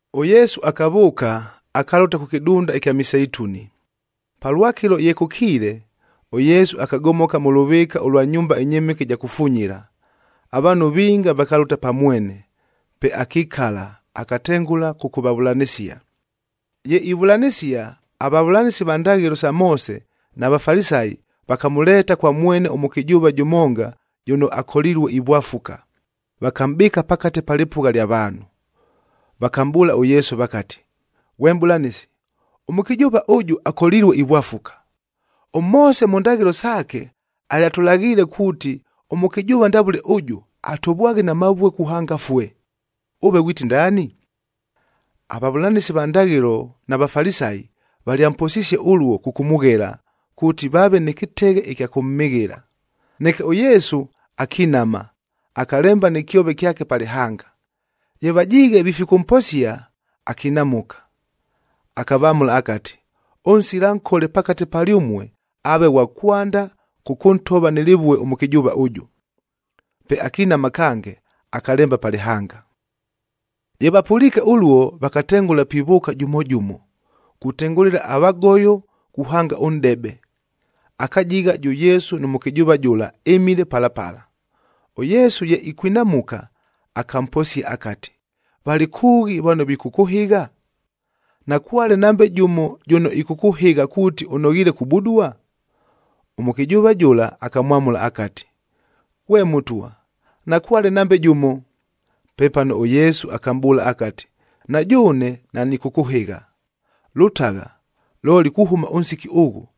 ɄYesu akavʉʉka, akalʉta kʉ kɨdunda ɨkya Miseituni. Palwakɨlo ye kʉkiile, ʉYesu akagomoka mʉ lʉvɨɨka ʉlwa nyumba ɨnyɨmɨke ɨja kufunyila. Avaanhu vinga vakalʉta pa mwene, pe akikala, akatengʉla kʉkʉvavʉlanɨsia. Ye ivʉlanɨsia, avavʉlanɨsi va ndaghɨlo sa Moose na Vafalisayi,a vakamʉleeta kwa mwene ʉmʉkɨjʉʉva jʉmonga jʉno akolilue ivwafuka, vakamʼbɨɨka pakate pa lɨpʉgha lya vaanhu. Vakamʼbʉʉla ʉYesu vakati, “Ghwe Mʼbʉlanɨsi, ʉmʉkɨjʉʉva ʉjʉ akolilue ivwafuka. ɄMoose mʉ ndaghɨlo saake, alyatʉlaghiile kuuti ʉmʉkɨjʉʉva ndavʉle ʉjʉ, atovwaghe na mavue kuhanga afue.b Ʉve ghwiti ndaani?” Avavʉlanɨsi va ndaghɨlo na Vafalisayi valyamposisie ʉluo kʉkʉmʉghela, kuuti vaave nɨ kɨteghe ɨkya kʉmhɨghɨla. Neke ʉYesu akinama, akalemba nɨ kyove kyake pa lɨhanga. Ye vajiighe vifikʉmposia, akinamʉka, akavamʉla akati, “Ʉnsila nkole pakate palyʉmue, aave ghwa kwanda kʉkʉntova nɨ lɨvue ʉmʉkɨjʉʉva ʉjʉ.” Pe akinama kange, akalemba pa lɨhanga. Ye vapʉliike ʉluo, vakatengʉla pivʉʉka jʉmo jʉmo, kutengʉlɨla avagoyo kuhanga ʉnʼdebe. Akajigha jʉ Yesu nʉ mʉkɨjʉʉva jʉla ɨmile pala pala. ɄYesu ye ikwinamuka, akamposia akati, “Valɨ kʉʉghi vano vikʉkʉhɨgha? Nakwale nambe jʉmo jʉno ɨkʉkʉhɨgha kuuti ʉnoghiile kubudua?” Ʉmʉkɨjʉʉva jʉla akamwamʉla akati, “Ghwe Mʉtwa, nakwale nambe jʉmo!” Pepano ʉYesu akamʼbʉʉla akati, “Na jʉʉne nanɨkʉkʉhɨgha. Lʉtagha, looli kuhʉma ʉnsiki ʉghʉ,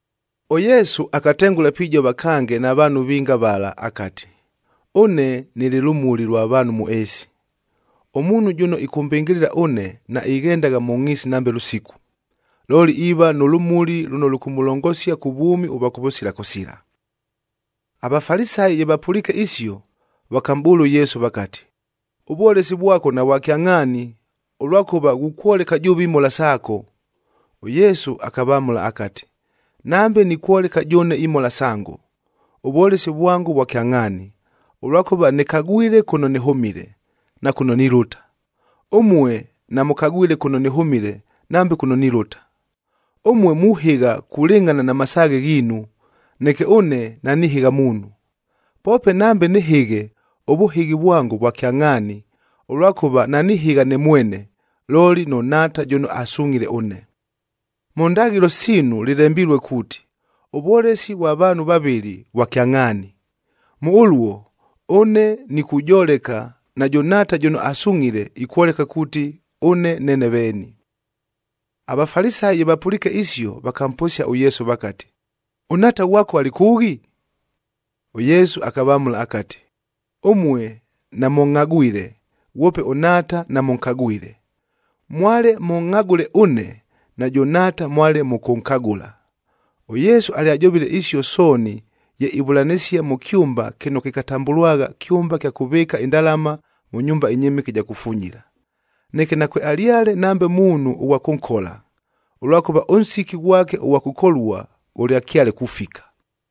ɄYesu akatengʉla pijova kange na vaanhu vinga vala akati, “Ʉne nɨlɨ lʉmuli lwa vaanhu mʉ ɨɨsi. Ʉmuunhu jʉno ɨkʉmbɨngɨlɨla ʉne, naighendagha mʉ ngʼhiisi nambe lʉsiku, looli iiva nʉ lʉmuli lʉno lʉkʉmʉlongosia kʉ vwʉmi ʉvwa kʉvʉsila kʉsila.” AVafalisayi ye vapʉliike isio, vakamʼbʉʉla ʉYesu vakati, “Ʉvwolesi vwako navwa kyangʼhaani, ʉlwakʉva ghukwoleka jʉʉve imhola saako.” ɄYesu akavamʉla akati, “Nambe nikwoleka jʉʉne imhola sango, ʉvwolesi vwango vwa kyangʼhaani, ʉlwakʉva nɨkagwile kʉno nɨhʉmile, na kʉno nilʉta. Ʉmue namʉkagwile kʉno nɨhʉmile nambe kʉno nilʉta. Ʉmue muhɨgha kulɨngʼhana na masaaghe ghiinu, neke ʉne nanihɨgha muunhu. Poope nambe nɨhɨghe, ʉvʉhɨghi vwango vwa kyangʼhaani, ʉlwakʉva nanihɨgha ne mwene, looli nʉ Nhaata jʉno asungʼhile ʉne. Mʉ ndaghɨlo siinu lɨlembilue kuuti, ʉvwolesi vwa vaanhu vavɨlɨ, Mʉ ʉluo, ʉne nikujoleka, najʉ Nhaata jʉno asungʼhile ikwoleka kuuti ʉne neene veeni.” AVafalisayi ye vapʉliike isio, vakamposia ʉYesu vakati, “ɄNhaata ghwako alɨ kʉʉghi?” ɄYesu akavamʉla akati, “Ʉmue namʉngʼhagwile, ghwope ʉNhaata namʉnkagwile. Mwale mʉngʼhagʉle ʉne, najʉ Nhaata mwale mʉkʉnkagʉla.” ɄYesu alyajovile isio sooni ye ivʉlanɨsia mʉ kyʉmba kɨno kɨkatambʉlwagha kyʉmba kya kʉvɨɨka indalama mʉ nyumba ɨnyɨmɨke ɨja kufunyila. Neke nakwealyale nambe muunhu ʉghwa kʉnkola, ʉlwakʉva ʉnsiki ghwake ʉghwa kʉkolua ghʉlyakyale kufika.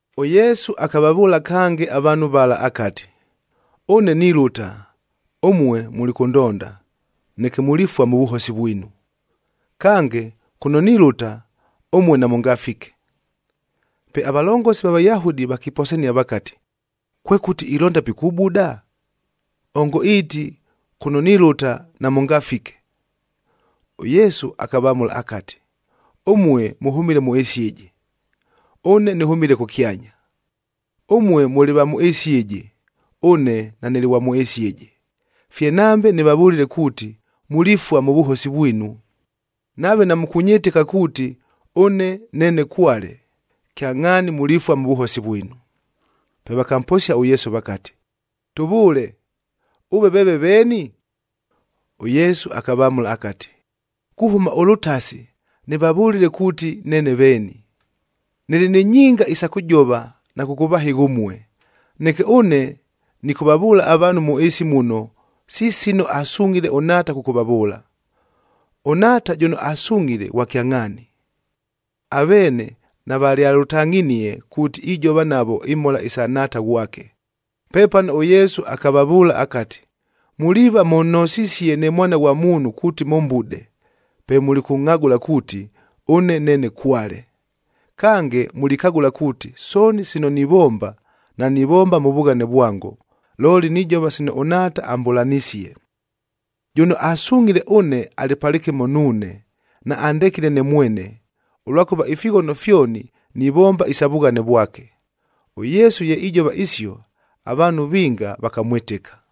ɄYesu akavavʉʉla kange avaanhu vala akati, “Ʉne nilʉta, ʉmue mulikʉndonda, neke mulifua mʉ vʉhosi vwinu. Kange, kʉno nilʉta, ʉmue namʉngafike.” Pe avalongosi va Vayahudi vakiposania vakati, “Kwekʉti ilonda pikubuda? Ongo iiti, ‘Kʉno nilʉta namʉngafike’?” ɄYesu akavamʉla akati, “Ʉmue mʉhʉmile mʉ ɨɨsi ɨjɨ, ʉne nɨhʉmile kʉkyanya. Ʉmue mʉlɨ va mʉ ɨɨsi ɨjɨ, ʉne nanɨlɨ ghwa mʉ ɨɨsi ɨjɨ. Fye nambe nɨvavʉlile kuuti mulifua mʉ vʉhosi vwinu. Nave namukwɨtɨka kuuti, ‘Ʉne Neene Kwale,’e kyangʼhaani mulifua mʉ vʉhosi vwinu.” Pe vakamposia ʉYesu vakati, “Tʉvʉʉle, ʉve veeve veeni?” ɄYesu akavamʉla akati, “Kuhʉma ʉlʉtasi nɨvavʉlile kuuti neene veeni. Nɨlɨ ni nyinga isa kʉjova na kʉkʉvahɨgha ʉmue. Neke ʉne nɨkʉvavʉʉla avaanhu mʉ ɨɨsi muno si sino asungʼhile ʉNhaata kʉkʉvavʉʉla. ɄNhaata jʉno asungʼhile ghwa kyangʼhaani.” Aveene navalyalʉtangʼhinie kuuti ijova navo imhola isa Nhaata ghwake. Pepano ʉYesu akavavʉʉla akati, “Muliiva mʉnhosisie ne Mwana ghwa Muunhu kuuti mʉmbude,f pe mulikʉngʼhagʉla kuuti, ‘Ʉne Neene Kwale.’ Kange, mulikagʉla kuuti sooni sino nivomba, nanivomba mʉ vughane vwango, looli nijova sino ʉNhaata ambʉlanisie. Jʉno asungʼhile ʉne alɨ palɨkɨmo nuune, naandekile ne mwene, ʉlwakʉva ifighono fyoni nivomba isa vughane vwake.” ɄYesu ye ijova isio, avaanhu vinga vakamwɨtɨka.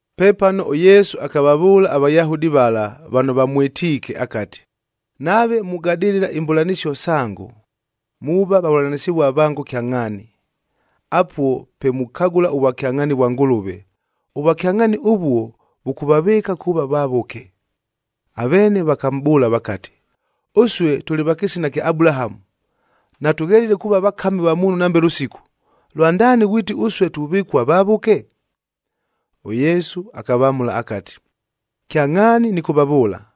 Pepano ʉYesu akavavʉʉla aVayahudi vala, vano vamwɨtiike akati, “Nave mugadɨlɨla imbʉlanɨsio sango, muuva vavʉlanɨsɨvua vango kyangʼhaani. Apuo pe mukagʉla ʉvwakyangʼhaani vwa Ngʉlʉve. Ʉvwakyangʼhaani ʉvuo, vʉkʉvavɨɨka kuuva vavʉke.” Aveene vakamʼbʉʉla vakati, “Ʉsue tʉlɨ va kɨsina kya Abulahamu. Natʉghelile kuuva vakami va muunhu nambe lʉsiku! Lwandaani ghwiti ʉsue tuvɨkua vavʉke?” ɄYesu akavamʉla akati, “Kyangʼhaani nɨkʉvavʉʉla,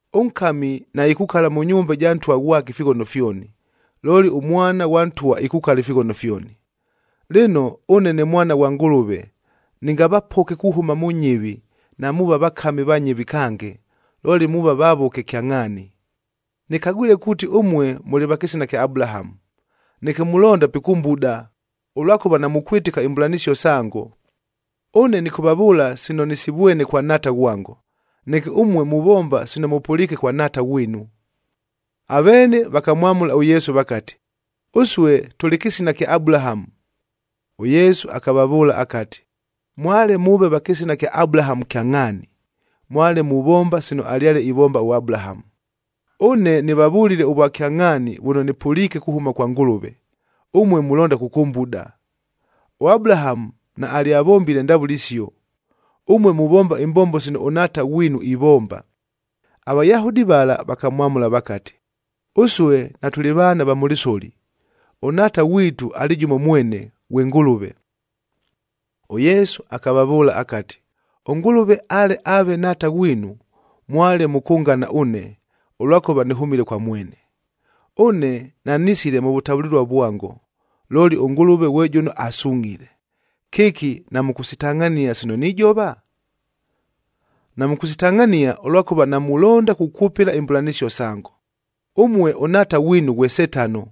Ʉnkami naikukala mʉ nyumba ɨja ntwa ghwake ifighono fyoni, looli ʉmwana ghwa ntwa ikukala ifighono fyoni. Lɨno, ʉne ne Mwana ghwa Ngʉlʉve nɨngavapoke kuhʉma mʉ nyɨvi, namuuva vakami va nyɨvi kange, looli muuva vavʉke kyangʼhaani. Nɨkagwile kuuti ʉmue mʉlɨ va kɨsina kya Abulahamu, neke mulonda pikʉmbuda, ʉlwakʉva namukwɨtɨka imbʉlanɨsio sango. Ʉne nɨkʉvavʉʉla sino nɨsivwene kwa Nhaata ghwango, neke ʉmue muvomba sino mʉpʉliike kwa nhaata ghwinu.” Aveene vakamwamʉla ʉYesu vakati, “Ʉsue tʉlɨ kɨsina kya Abulahamu.”h ɄYesu akavavʉʉla akati, “Mwale mʉʉve va kɨsina kya Abulahamu kyangʼhaani, mwale muvombagha sino alyale ivomba ʉAbulahamu. Ʉne nɨvavʉlile ʉvwakyangʼhaani vʉno nɨpʉliike kuhʉma kwa Ngʉlʉve, ʉmue mulonda kʉkʉmbuda! ɄAbulahamu naalyavombile ndavʉle isio. Ʉmue muvomba imbombo sino ʉnhaata ghwinu ivomba.” AVayahudi vala vakamwamʉla vakati, “Ʉsue natʉlɨ vaana va mʉ lɨsoli, ʉNhaata ghwitu alɨ jʉmo mwene, ghwe Ngʉlʉve.” ɄYesu akavavʉʉla akati, “ɄNgʉlʉve ale aave Nhaata ghwinu, mwale mʉkʉngana ʉne, ʉlwakʉva nɨhʉmile kwa mwene. Ʉne nanisile mʉ vʉtavʉlɨlua vwango, looli ʉNgʉlʉve ghwe jʉno asungʼhile. Kɨki namʉkʉsitangʼhania sino nijova? Namʉkʉsitangʼhania, ʉlwakʉva namulonda kukwʉpɨla imbʉlanɨsio sango. Ʉmue ʉnhaata ghwinu ghwe Setano,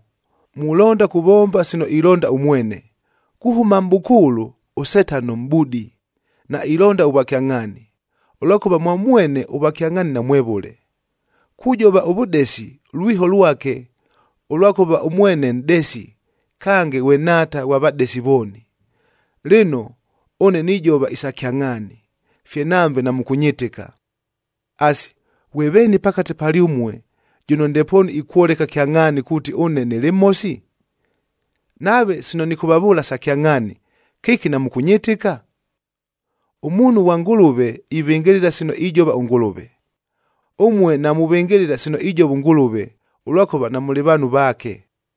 mulonda kuvomba sino ilonda ʉmwene. Kuhʉma mʼbʉkʉʉlʉ ʉSetano mʼbudi, nailonda ʉvwakyangʼhaani, ʉlwakʉva mwa mwene ʉvwakyangʼhaani namwevʉle. Kujova ʉvʉdesi, lwiho lwake, ʉlwakʉva ʉmwene nʼdesi, kange ghwe nhaata ghwa vadesi vooni. Lɨno, ʉne nijova isa kyangʼhaani, fye nambe namʉkʉnyɨtɨka. “Asi, ghwe veeni pakate palyʉmue jʉno ndepoonu ikwoleka kyangʼhaani kuuti ʉne nɨlɨ mhosi? Nave sino nɨkʉvavʉʉla sa kyangʼhaani, kɨki namʉkʉnyɨtɨka? Ʉmuunhu ghwa Ngʉlʉve ivɨngɨlɨla sino ijova ʉNgʉlʉve. Ʉmue namuvɨngɨlɨla sino ijova ʉNgʉlʉve, ʉlwakʉva namʉlɨ vaanhu vaake.”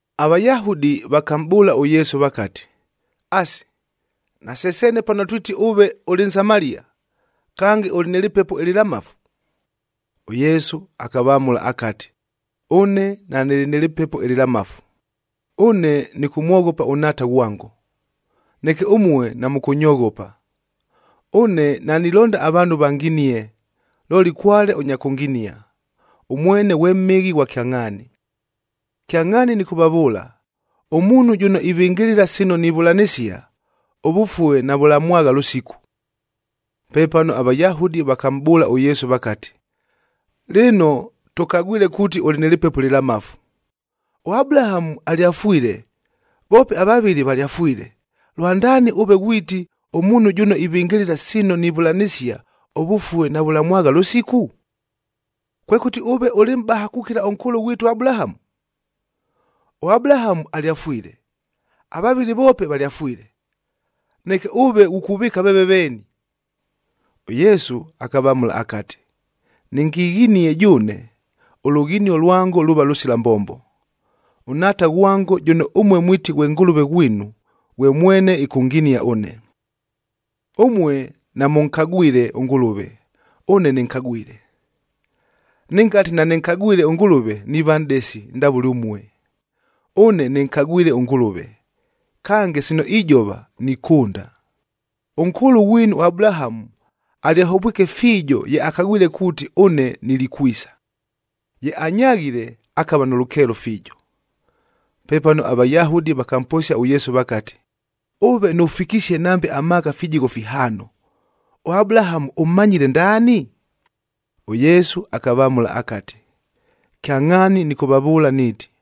AVayahudi vakamʼbʉʉla ʉYesu vakati, “Asi, nase seene pano twiti ʉve ʉlɨ Nsamalia, kange ʉlɨ nɨ lɨpepo ɨlɨlamafu?” ɄYesu akavamʉla akati, “Ʉne nanɨlɨ nɨ lɨpepo ɨlɨlamafu. Ʉne nɨkʉmwoghopa ʉNhaata ghwango, neke ʉmue namʉkʉnyoghopa. Ʉne nanilonda avaanhu vanginie, looli kwale ʉnya kʉnginia, ʉmwene ghwe mhɨghi ghwa kyangʼhaani. Kyangʼhaani nɨkʉvavʉʉla, ʉmuunhu jʉno ivɨngɨlɨla sino nivʉlanɨsia, ʉvʉfue navʉlamwagha lʉsiku.” Pepano aVayahudi vakamʼbʉʉla ʉYesu vakati, “Lɨno, tʉkagwile kuuti ʉlɨ nɨ lɨpepo ɨlɨlamafu! ɄAbulahamu alyafwile, voope avavɨli valyafwile, lwandaani ʉve ghwiti, ‘Ʉmuunhu jʉno ivɨngɨlɨla sino nivʉlanɨsia, ʉvʉfue navʉlamwagha lʉsiku’? Kwekʉti ʉve ʉlɨ mʼbaha kukila ʉnkʉʉlʉ ghwitu ʉAbulahamu? ɄAbulahamu alyafwile, avavɨli voope valyafwile. Neke ʉve ghukuvɨɨka veeve veeni?” ɄYesu akavamʉla akati, “Nɨngighinie jʉʉne, ʉlughinio lwango luuva lʉsila mbombo. ɄNhaata ghwango, jʉno ʉmue mwiti ghwe Ngʉlʉve ghwinu, ghwe mwene ɨkʉnginia ʉne. Ʉmue namʉnkagwile ʉNgʉlʉve, ʉne nɨnkagwile. Nɨngati nanɨnkagwile ʉNgʉlʉve, niiva nʼdesi ndavʉle ʉmue. Ʉne nɨnkagwile ʉNgʉlʉve, kange sino ijova nikʉnda. Ʉnkʉʉlʉ ghwinu ʉAbulahamu alyahovwike fiijo ye akagwile kuuti ʉne nilikwisa, ye anyaghile, akava nʉ lʉkeelo fiijo.” Pepano aVayahudi vakamposia ʉYesu vakati, “Ʉve nʉfikisie nambe amaaka fijigho fihaano, ʉAbulahamu ʉmmanyile ndaani?” ɄYesu akavamʉla akati, “Kyangʼhaani nɨkʉvavʉʉla niiti,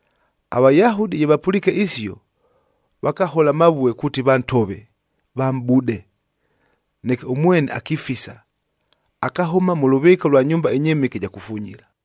AVayahudi ye vapʉliike isio, vakahola amavue kuuti vantove, vamʼbude. Neke ʉmwene akifisa, akahʉma mʉ lʉvɨɨka ʉlwa nyumba ɨnyɨmɨke ɨja kufunyila.